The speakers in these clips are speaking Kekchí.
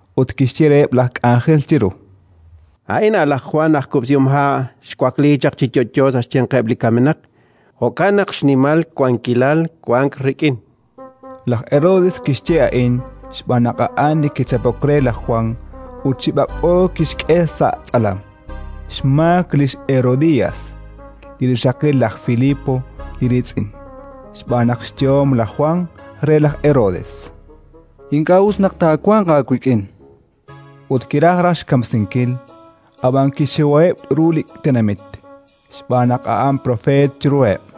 ut kixye reheb' laj k'anjel chiru: “A'in a'an laj Jwan aj kub'sihomha'; xwakliik chaq chi yo'yo sa' xyanqeb' li kamenaq: jo'kan naq xnimal wankilal wank rik'in”. Laj Herodes kixye a'in xb'aan naq a'an li kichapok re laj Jwan ut chi b'ak'b'o kixk'e sa' tz'alam, xmaak lix Herodías, li rixaqil laj Filipo li riitz'in. Xb'aan naq xyehom laj Jwan re laj Herodes: “Ink'a' us naq taawanq aawik'in”. Ut kiraj raj xkamsinkil, ab'an kixxiwaheb' ru li tenamit, xb'aan naq a'an propeet chiruheb'.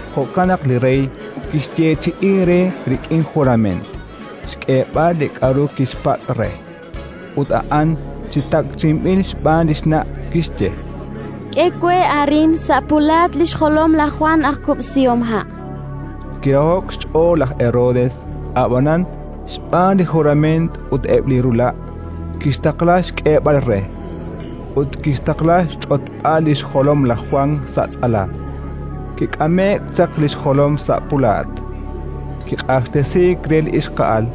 jo'kan naq li rey kixyeechi'i re, rik'in jurament, xk'eeb'al li k'aru tixpatz' re. Ut a'an, chi takchi'inb'il xb'aan li xna', kixye: —K'e we arin, sa' pulaat, li xjolom laj Jwan aj kub'sihomha'. Kiraho'k xch'ool laj Herodes, ab'anan, xb'aan li jurament ut eb' li rula', kixtaqla xk'eeb'al re; ut kixtaqla xch'otb'al li xjolom laj Jwan sa' tz'alam. Kik'ame'k chaq li xjolom sa' pulaat, kiq'axtesiik re li ixqa'al,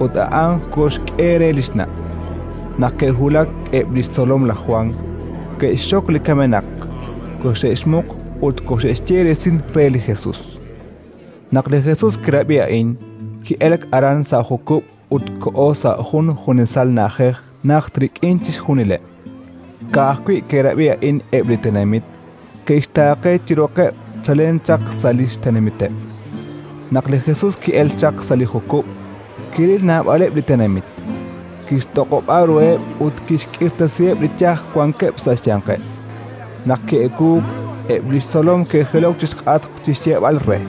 ut a'an koxk'e re li xna'. Naq ke'wulak eb' li xtzolom laj Jwan, ke'xxok li kamenaq, koxe'xmuq ut koxe'xye resil re li Jesus. Naq li Jesus kirab'i a'in, ki'elk aran sa' jukub' ut koho sa' jun junesal na'ajej najt rik'in chixjunileb'. Ka'ajwi' ke'rab'i a'in eb' li tenamit, ke'xtaaqe chi roqeb' chalen chaq sa' li xtenamiteb'. Naq li Jesus ki'elk chaq sa' li jukub', kiril naab'aleb' li tenamit, kixtoq'ob'a ruheb' ut kixk'irtasiheb' li yaj wankeb' sa' xyanqeb'. Naq ki'ewuuk, eb' li xtzolom ke'jilok chi xk'atq chi xyeeb'al re: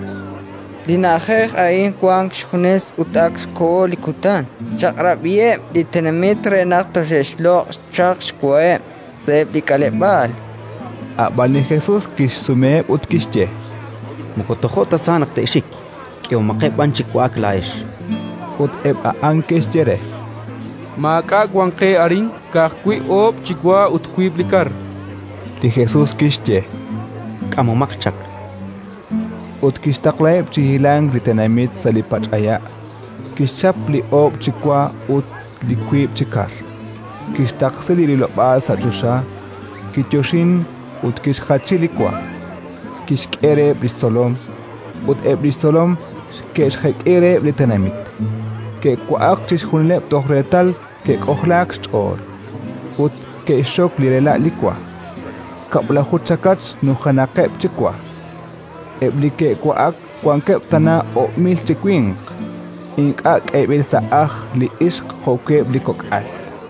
—Li na'ajej a'in wank xjunes, ut ak xkoho li kutan. Chaq'rab'iheb' li tenamit re naq toxe'xloq' chaq xwaheb' sa'eb' li k'aleb'aal. Ab'an li Jesus kixsumeheb' ut kixye: —Moko tojo' ta sa naq te'xik; k'ehomaqeb' b'an chi wa'ak laa'ex. Ut eb' a'an ke'xye re: —Maak'a' wank qe arin, ka'ajwi' oob' chi wa ut wiib' li kar. Li Jesus kixye: —K'amomaq chaq. Ut kixtaqlaheb' chi hilank li tenamit sa' li pach'aya', kixchap li oob' chi wa ut li wiib' chi kar, kixtaqsi li rilob'aal sa' choxa, kiyoxink ut kixjachi li wa; kixk'e reheb' li xtzolom, ut eb' li xtzolom ke'xjek'i reheb' li tenamit. Ke'wa'ak chixjunileb' toj reetal ke'k'ojlaak xch'ool; ut ke'xxok li rela' li wa: kab'laju chakach nujenaqeb' chi wa. Eb' li ke'wa'ak wankeb' tana oob' mil chi winq, ink'a' k'eeb'ileb' sa' ajl li ixq jo'wi' eb' li kok'al.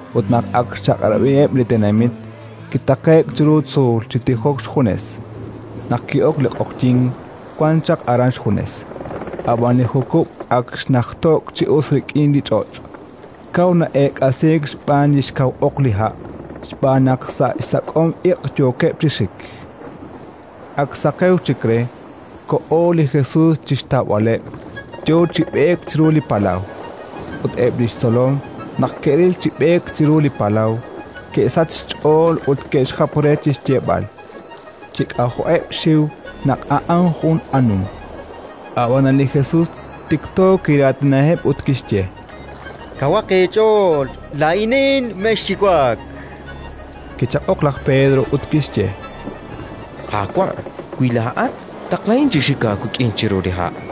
Ut naq ak xchaq'rab'iheb' li tenamit, kitaqe'k chiru tzuul chi tijok xjunes. Naq ki'ok li q'oqyink, wan chaq aran xjunes. Ab'an li jukub' ak xnajto'k chi us rik'in li ch'och', kaw na'eek'asiik xb'aan li xkaw oq li ha', xb'aan naq sa' xsak'om iq' yookeb' chi xik. Ak saqewk chik re, koho li Jesus chi xtawb'aleb', yo chi b'eek chiru li palaw. Ut eb' li xtzolom, naq ke'ril chi b'eek chiru li palaw, ke'sachk xch'ool ut ke'xjap re chi xyeeb'al, chi k'ajo'eb' xxiw, naq a'an jun anum. Ab'anan li Jesus tikto kiraatinaheb' ut kixye: —Kawaq eech'ool: laa'inin! Mexxiwak. Kichaq'ok laj Pedro ut kixye: —Qaawa', wi laa'at, taqlahin chi xik aawik'in chiru li ha'.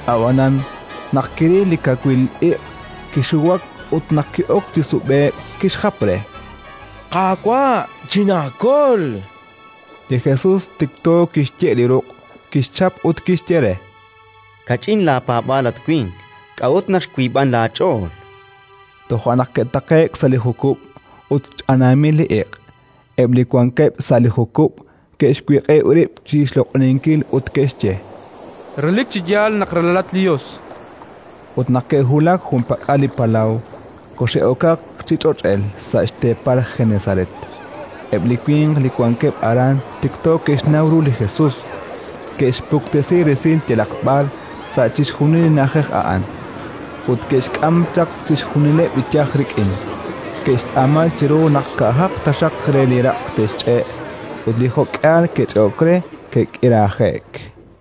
Ab'anan, naq kiril li kawil iq', kixiwak ut, naq ki'ok chi sub'e'k, kixjap re: —Qaawa', chinaakol, chan re. Li Jesus tikto kixye' li ruq', kixchap ut kixye re: —Kach'in laapaab'aal, at winq. K'a'ut naq xwiib'ank laach'ool? Toja' naq ke'taqe'k sa' li jukub' ut ch'anaamil li iq'. Eb' li wankeb' sa' li jukub' ke'xwiq'ib' rib' chi xloq'oninkil ut ke'xye: —Relik chi yaal naq Ralalat li Yos. Ut naq ke'wulak junpak'al li palaw, koxe'okaq chi ch'och'el, sa' xteepal Genesaret. Eb' li winq li wankeb' aran tikto ke'xnaw ru li Jesus, ke'xpuktesi resil yalaq b'ar sa' chixjunil li na'ajej a'an, ut ke'xk'am chaq chixjunileb' li yaj rik'in. Ke'xtz'aama chiru naq ka'aj taxaq re li raq' te'xch'e'; ut li jo'k'ihal ke'ch'e'ok re, ke'k'iraje'k.